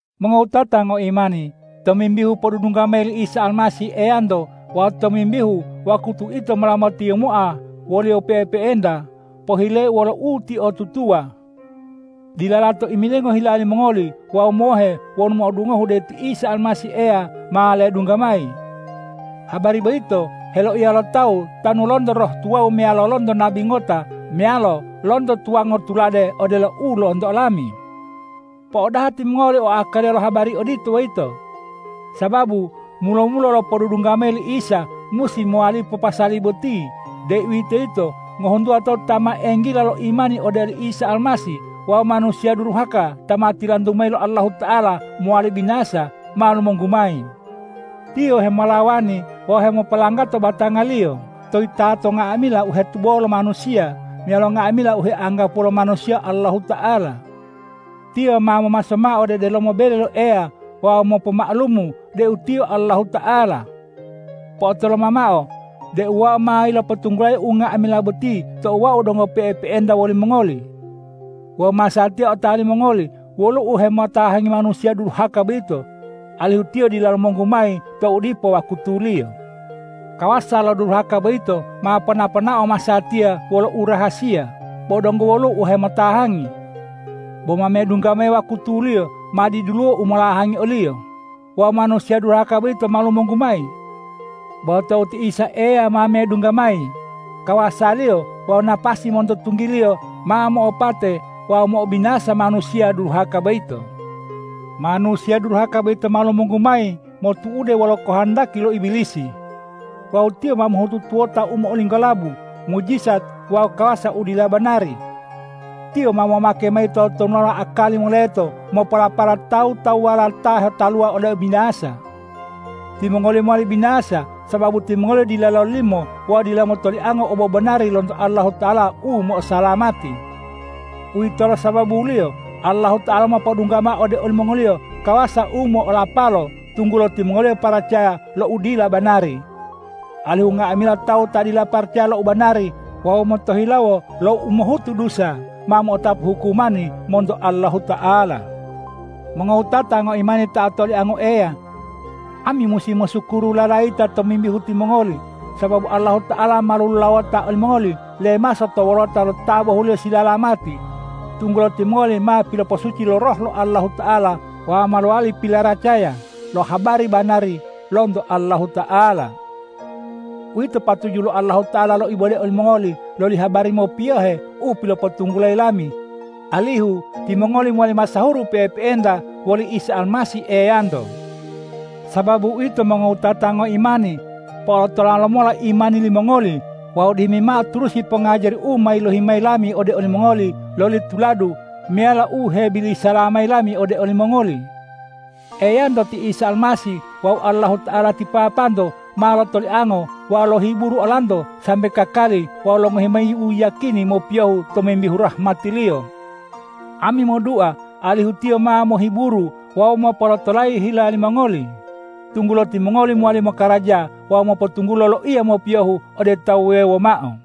Mongowutata ngoimani, tomimbihu podudungga mayi li Isa Almasih Eyanto wawu tomimbihu wakutu ito mola motiyimoa wo-Liyo pe'epe'enta, pohileu wolo utiotutuwa: Dila lato imilingo hila limongoli wawu mohe wonu mo'odungohu deu ti Isa Almasih Eya ma ledungga mayi. Habari boyito heloiya lo tawu tanu lonto roh tuwawu meyalo lonto nabi ngota meyalo lonto tuwango tulade odelo u lonto olami. Po'odaha timongoli o akaliya lo habari odito boyito. Sababu mulo-mulo lo podudungga mayi li Isa musi mowalipo pasali boti, deuwitoyito ngohuntuwa tawu ta ma enggila lo imani ode oli Isa Almasih wawu manusiya duruhaka ta ma tilantu mayi lo Allahuta'ala mowali binasa, ma lumonggu mayi. Tiyo hemolawani wawu hemopolanggato batangaliyo to yitato nga'amila u hetubo lo manusiya meyalo nga'amila u heanggapuwo lo manusiya Allahuta'ala. Tiyo ma momaso mao ode delomo bele lo Eya wawu mopoma'alumu deu tiyo Allahuta'ala. Po'otoloma mao deu wau ma yilopotunggulayi unga'amila boti tou wau donggo pe'epe'enta wolimongoli. Wawu masatiya otawa limongoli woluwo u hemotahangi manusiya duruhaka boyito, alihu tiyo dila lumonggu mayi tou dipo wakutuliyo. Kawasa lo uduruhaka boyito ma pona-ponao masatiya wolo u rahasiya, bo donggo woluwo u hemo'otahangi. Bo ma medungga mayi wakutuliyo ma diduluwo u molahangi oliyo wawu manusiya duruhaka boyito ma lumonggu mayi. Bo tou ti Isa Eya ma medungga mayi, kawasa-Liyo wawu napasi monto tunggi-Liyo ma mo'opate wawu mo'obinasa manusiya duruhaka boyito. Manusiya duruhaka boyito ma lumonggu mayi motu'ude wolo kohondaki lo Ibilisi. Wawu tiyo ma mohutu tuwota u mo'olinggolabu, mujijat wawu kawasa u dila banari. Tiyo ma momake mayi totonulala akali moleto mopolapala tawu-tawuwala ta hetaluwa ode ubinasa. Timongoliyo mowali binasa, sababu timongoliyo dila lololimo wawu dila motoliango obobanari lonto Allahuta'ala u mo'osalamati. Uwitolo sababuliyo Allahuta'ala mopodungga mao ode olimongoliyo kawasa u mo'olapalo, tunggulo timongoliyo paracaya lo u dila banari, alihu nga'amila tawu ta dila paracaya lo u banari wawu motohilawo lo umohutu dusa, ma mo'otapu hukumani monto Allahuta'ala. Mongowutata ngoimani ta otoliango Eya! Ami musi mosukuru lalayita tomimbihu timongoli, sababu Allahuta'ala ma lolulawota olimongoli lemaso to wolota lo ta bohuliyo silalamati, tunggulo timongoli ma piloposuci lo Roh lo Allahuta'ala wawu ma lowali pilaracaya lo habari banari lonto Allahuta'ala. Uwito patuju lo Allahuta'ala loibode olimongoli loli habari mopiyohe u pilopotunggulayi lami, alihu timongoli mowali masahuru pe'epe'enta woli Isa Almasih Eyanto. Sababu uwito mongowutata ngoimani, po'olotola lomola imani limongoli wawu dihimi mao turusi pongajari u ma yilohi mayi lami ode olimongoli loli tuladu meyalo u hebilisala mayi lami ode olimongoli. Eyanto ti Isa Almasih wawu Allahuta'ala ti Papanto ma lotoliango wawu lohiburu olanto sambe kakali wawu longohi mayi uyiyakini mopiyohu tomimbihu rahmati-Liyo. Ami modua alihu Tiyo ma mohiburu wawu mopolotolayi hila limongoli, tunggulo timongoli mowali mokaraja wawu mopotunggulo loiya mopiyohu ode tawu wuwewo mao.